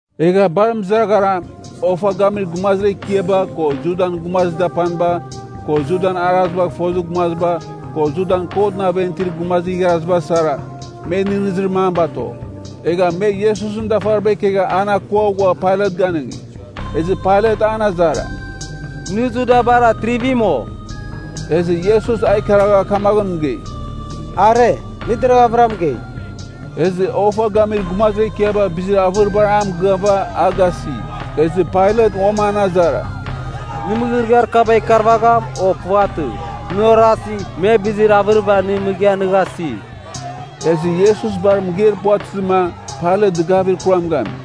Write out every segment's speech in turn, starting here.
Egha bar mɨzaraghara, ofa gamir gumazir ekiaba, ko Judan gumazir dapaniba, ko Judan arazibagh fozir gumaziba, ko Judan kotɨn aven itir gumazir igharaziba sara, me nɨghnɨzir mam bato. Egha me Iesusɨn dafariba ikegha an akua ghua Pailat ganɨngi. Ezɨ Pailat an azara, “Nɨ Judabar Atrivim, o?” Ezɨ Iesus a ikaragha kamaghɨn mɨgei, “Are, nɨ deraghavɨra mɨgei.” Ezɨ ofa gamir gumazir ekiaba bizir avɨribar a mɨgɨava, a gasi. Ezɨ Pailat uam an azara, “Nɨ mɨgɨrɨgɨar kaba ikarvagham, o puvatɨ? Nɨ orasi, me bizir avɨriba nɨ mɨgɨa nɨ gasi.” Ezɨ Iesus bar mɨgeir puvatɨzɨma, Pailat dɨgavir kuram gami.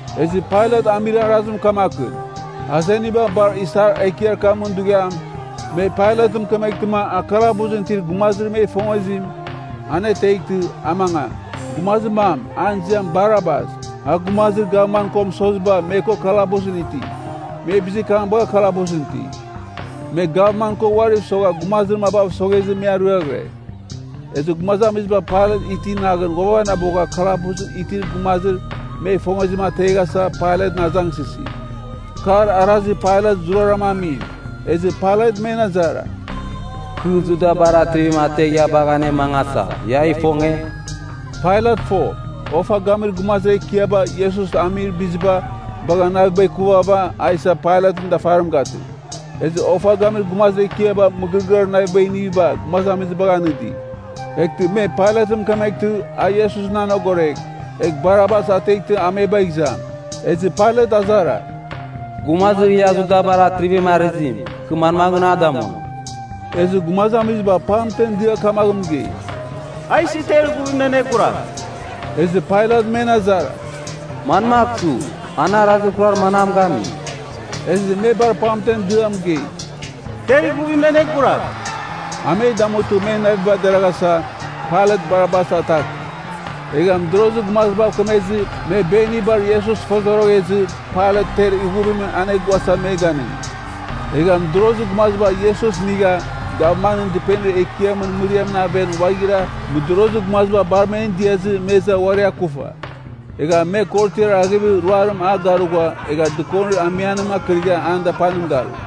Ezɨ Pailat amir arazim kamakɨn, azeniba bar isar ekiar kamɨn dughiam, me Pailatɨn mɨkɨmtɨma a kalabusɨn itir gumazir me ifongezim, aneteghtɨ, a mangam. Gumazir mam, an ziam Barabas, a gumazir gavman ko mɨsoziba me ko kalabusɨn iti. Me bizir kam bagha kalabusɨn iti. Me gavman ko uariv sogha gumazir mabav soghezɨ me ariaghɨre. Ezɨ gumazamiziba Pailat iti naghɨn ghuavanabogha kalabusɨn itir gumazir me ifongezim ateghasa Pailatɨn azangsɨsi. Kar arazir Pailat zurara amim. Ezɨ Pailat men azara, “Kɨ Judabar Atrivim ategh ia bagh anemangasa, ia ifonge?” Pailat fo, ofa gamir gumazir ekiaba Iesus amir biziba bagha naviba ikuvava, a isa Pailatɨn dafarim gatɨ. Ezɨ ofa gamir gumazir ekiaba mɨgɨrɨgɨar navibagh iniviba gumazamizibagh anɨdi. Eghtɨ me Pailatɨn mɨkemeghtɨ a Iesusɨn anogoregh, egh Barabas ateghtɨ a me bagh izam. Ezɨ Pailat azara, “Gumazir ia Judabar atrivim arɨzim, kɨ manmaghɨn a damuam?” Ezɨ gumazamiziba pamtem dia kamaghɨn mɨgei, “A isɨ ter ighuvimɨn aneguragh!” Ezɨ Pailat men azara, “Manmagh su? An arazir kurar manam gami?” Ezɨ me bar pamtem dɨa mɨgei, “Ter ighuvimɨn aneguragh!” A me damutɨ men naviba deraghasa, Pailat Barabas ataki. Egha mɨdorozir gumazibav kemezɨ me benibar Iesus fozoroghezɨ Pailat ter ighuvimɨn aneguasa me ganɨngi. Egha mɨdorozir gumaziba Iesus inigha gavmanɨn dɨpenir ekiamɨn mɨriamɨn aven ghuaghira mɨdorozir gumaziba bar men diazɨ me iza uari akufa. Egha me korotiar aghevir ruarim a garugha egha dɨkonir amianim arkɨrigha an dapanim garu.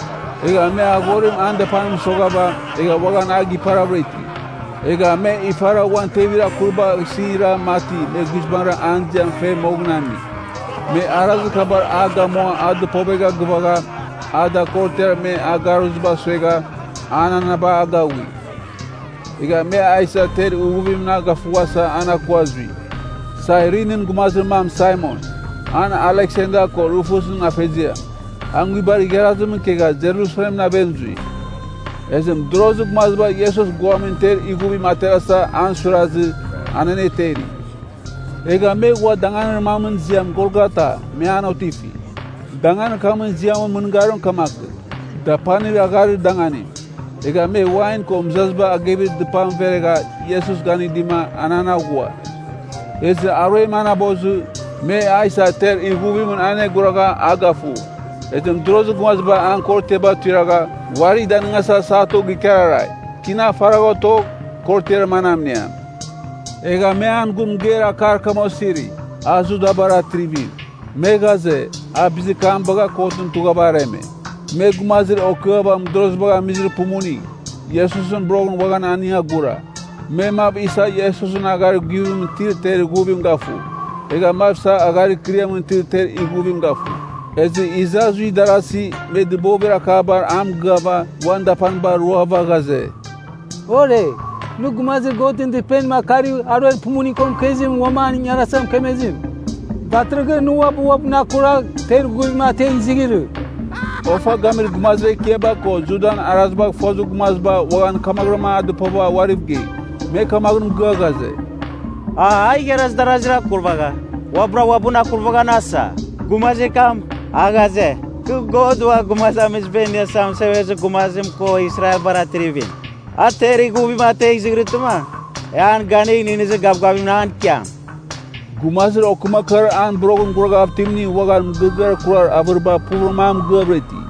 Egha me aghorim an dapanim mɨsoghava, egha uaghan a giparavɨra iti. Egha me ifara uan tevir akuribagh isɨn ira mati me guizbangɨra an ziam fe moghɨn ami. Me arazir kabar a gamua a dɨpovegha gɨvagha, a da korotiar me a agaghuiziba suegha, ananaba agaghui. Egha me a isa ter ighuvimɨn a gafughasa an akua zui. Sairinin gumazir mam Saimon, a Aleksander ko Rufusɨn afeziam, a nguibar igharazimɨn ikegha Jerusalemɨn aven zui. Ezɨ mɨdorozir gumaziba Iesus guamin ter ighuvim a terasa an suirazɨ, an aneteri. Egha me ghua danganir mamɨn ziam Golgata, me an otifi. (Danganir kamɨn ziamɨn mɨngarim kamakɨn, Dapanir Agharir Danganim.) Egha me wain ko mɨzaziba agevir dɨpam veregha Iesus ganɨdima an an aghua. Ezɨ aruem anabozɨ, me a isa ter ighuvimɨn aneguragha a gafu. Ezɨ mɨdorozir gumaziba an korotiaba tuiragh uari danɨngasa satu gikararai. Tina faragh otogh, korotiar manam iniam. Egha me an gun mɨgeir akar kam osiri, “A Judabar atrivim.” Me ghaze, a bizir kam bagha kotɨn tughava areme. Me gumazir okɨava mɨdorozibagh amizir pumuning, Iesusɨn boroghɨn uaghan aning agura. Me mav isa Iesusɨn agharir guvimɨn itir ter ighuvim gafu, egha mav isa agharir ikɨriamɨn itir ter ighuvim gafu. Ezɨ iza zui darasi me dɨbovibar a mɨgɨava uan dapaniba roava ghaze, “Ore! Nɨ, gumazir Godɨn Dɨpenim akarigh aruer pumuning ko mɨkezimɨn uam an ingarasa mɨkemezim, datɨrɨghɨn nɨ uabɨ uabɨn akuragh, ter ighuvim ategh izighirɨ!” Ofa gamir gumazir ekiaba ko Judan arazibagh fozir gumaziba uaghan kamaghɨram a dɨpova uariv gei. Me kamaghɨn mɨgɨa ghaze, “A igharaz darazir akurvagha uabɨra uabɨn akurvaghan asa! Gumazir kam, a ghaze, kɨ God Ua Gumazamiziba Iniasa Mɨsevezir Gumazim ko Israelbar Atrivim, a ter ighuvim ategh izighirɨtɨma, e an ganigh nɨghnɨzir gavgavim an ikiam.” Gumazir okɨmakɨar an boroghɨn guraghav itimning uaghan mɨgɨrɨgɨar kurar avɨriba puvɨram a mɨgɨavɨra iti.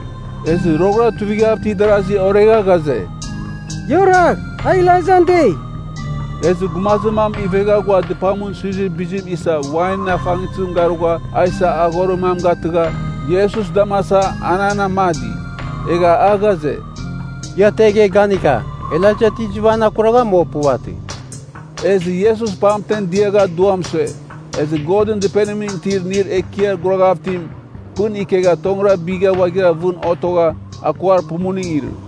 Ezɨ roghɨra tuivighav itir darasi oregha ghaze, “Ia oragh, a Elaijan dei.” Ezɨ gumazir mam ivegha ghua dɨpamɨn suizir bizim isa wainɨn afangtɨzim garugha a isa aghorir mam gatɨgha, Iesus damasa an an amadi. Egha a ghaze, “Ia tegh, e ganika, Elaija ti izɨva an akuragham, o puvatɨ.” Ezɨ Iesus pamtem diagha duam sue. Ezɨ Godɨn Dɨpenimɨn itir inir ekiar guraghav itim pɨn ikegha tongɨra bigha ghuaghira vɨn otogha akuar pumuning irɨ.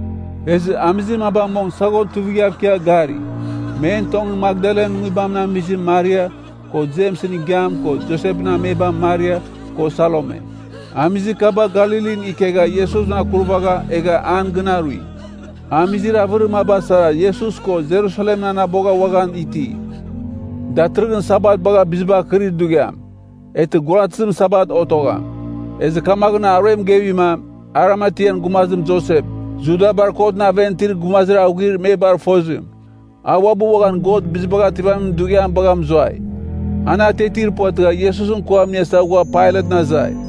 Ezɨ amizir maba mong saghon tuivighav ikia gari. Men tongɨn Makdalan nguibamɨn amizim Maria, ko Jemsɨn igiam ko Josepɨn amebam Maria, ko Salome. Amizir kaba Galilin ikegha Iesusɨn akurvagha egha an gɨn arui. Amizir avɨrir maba sara Iesus ko Jerusalemɨn anabogha uaghan iti. Datɨrɨghɨn Sabat bagha bizibar kɨrir dughiam. (Eghtɨ guaratɨzim Sabat otogham.) Ezɨ kamaghɨn aruem gevima, Arimatean gumazim Josep, Judabar kotɨn aven itir gumazir aghuir me bar fozim. A uabɨ uaghan God Bizibagh Ativamin Dughiam bagha mɨzuai. An atiatir puvatɨgha Iesusɨn kuam iniasa ghua Pailatɨn azai.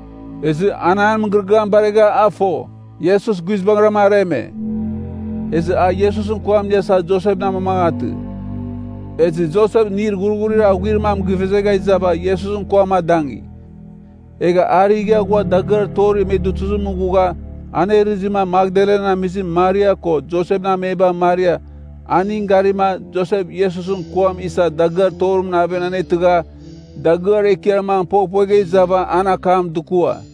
Ezɨ an an mɨgɨrɨgɨam baregha a fo, Iesus guizbangɨram areme. Ezɨ a Iesusɨn kuam iniasa Josepɨn amamangatɨ. Ezɨ Josep inir ghurghurir aghuir mam givezegha izava Iesusɨn kuam adangi. Egha a righa ghua dagɨar torir me dutuzimɨn ghugha anerɨzima Makdalan amizim Maria ko Josepɨn amebam Maria, aning garima, Josep Iesusɨn kuam isa dagɨar torimɨn aven anetɨgha, dagɨar ekiar mam poghpuegha izava an akam dukua.